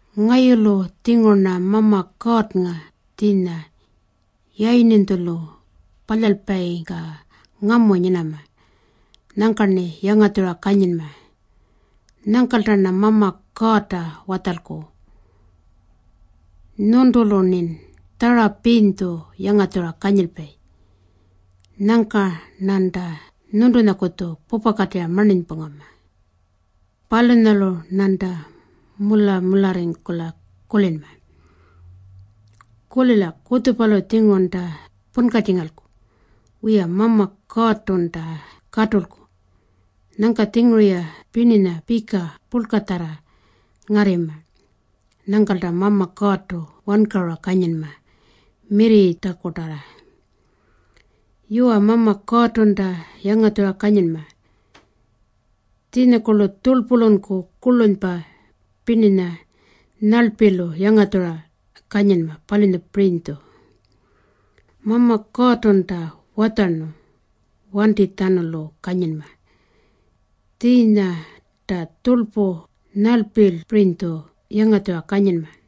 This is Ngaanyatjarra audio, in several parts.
Ngayulu-tjinguru-rna Mama Kuurrnga tjiinya yayirninytjulu palyalpayingka ngamu nyinama. Nyangka-rni yangatjura kanyinma. Nyangkalta-rna Mama Kuurrta watjalku, “Nyuntulu-rnin tjarapirinytju yangatjura kanyilpayi. Nyangka-rnanta nyuntunyakutju pupakatirra marninypungama. Palunyalu-rnanta mula-mularringkula kulinma.” Kulila. Kutjupalu-tjingurunta punkatjingalku. Wiya, Mama Kuurrtunta katulku. Nyangka-tjinguru-ya pirninya pika purlkanyatjarra ngarrima. Nyangkanta Mama Kuurrtu wankarura kanyinma mirrirritjakutarra. Yuwa, Mama Kuurrtunta yangatjura kanyinma. Tjiinyakurlu tjurlpulunku kurlunypa pirninya nyarlpilu yangatjura kanyinma, palunyapirinytju. Mama Kuurrtunta watjarnu wantinytjatjanulu kanyinma. Tjiinyanta tjurlpu nyarlpipirinytju yangatjura kanyinma.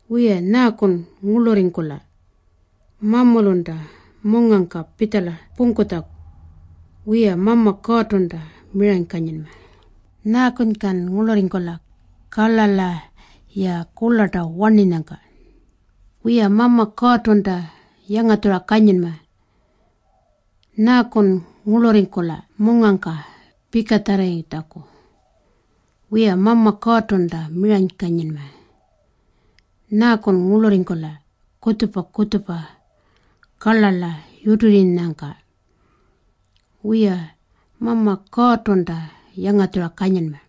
Wiya, nyaakun ngurlurringkula mamulunta mungangka pitjala pungkutjaku? Wiya, Mama Kuurrtunta miranykanyinma. Nyaakunykan ngurlurringkula karlarla-ya kurlarta warnirranyangka? Wiya, Mama Kuurrtunta yangatjura kanyinma. Nyaakun ngurlurringkula mungangka pikatjarrarritjaku? Wiya, Mama Kuurrtunta miranykanyinma. Nyaakun ngurlurringkula kutjupa-kutjupa karlarla yutirringkulanyangka? Wiya, Mama Kuurrtunta yangatjura kanyinma.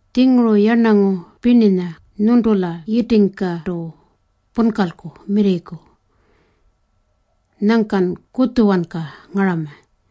Tjinguru yarnangu pirninya nyuntula yitingkartu punkalku mirrirriku. Nyangkan kutjuwanka ngarama.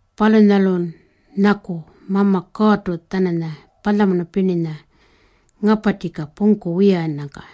Palunyalun nyaku Mama Kuurrtu-tjananya palyamunu pirninya ngaparrtjika pungku wiyannyangka.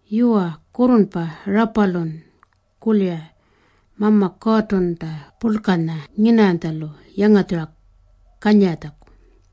Yuwa, kurrurnpa rapalun kulira Mama Kuurrtunta purlkanya nyinarranytjalu yangatjura kanyiratjaku.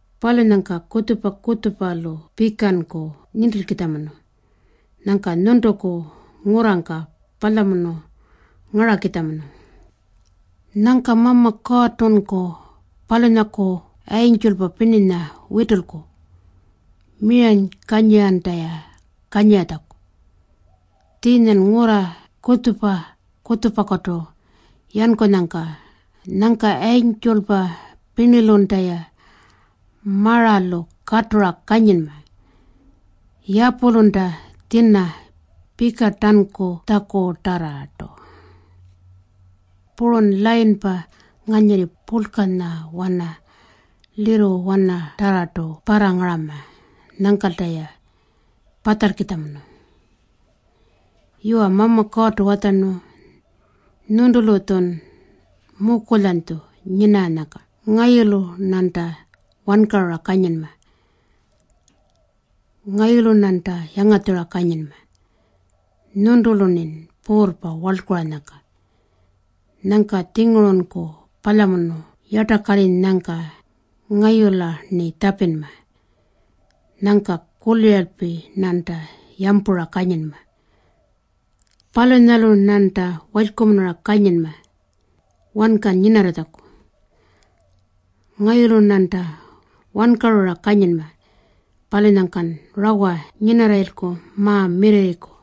Palunyangka kutjupa-kutjupalu pikanku nintilkitjamunu. Nyangka nyuntuku ngurrangka palyamunu ngarakitjamunu. Nyangka Mama Kuurrtunku palunyaku yayintjulpa pirninya witulku miranykanyiranta-ya kanyiratjaku, tjiinyan ngurra kutjupa-kutjupakutu yankulanyangka. Nyangka yayintjulpa pirnilunta-ya maralu katura kanyinma yapulunta tjina pikarntankutjakutarrartu. Purun layinpa nganyirri purlkanyawana lirruwanatarrartu parrangarama. Nyangkanta-ya patjalkitjamunu. Yuwa, Mama Kuurrtu watjarnu, “Nyuntulu-tjun mukulyanytju nyinarranyangka ngayulu-rnanta wankarura kanyinma. Ngayulu-rnanta yangatjura kanyinma nyuntulu-rnin puurrpa warlkuranyangka. Nyangka-tjingurunku palyamunu yartakarrinyangka ngayula-rni tjapinma. Nyangka kuliralpi-rnanta yampura kanyinma. Palunyalu-rnanta walykumunura kanyinma wanka nyinarratjaku. Ngayulu-rnanta wankarura kanyinma. Palunyangkan rawa nyinarrayilku ma-mirrirriku.”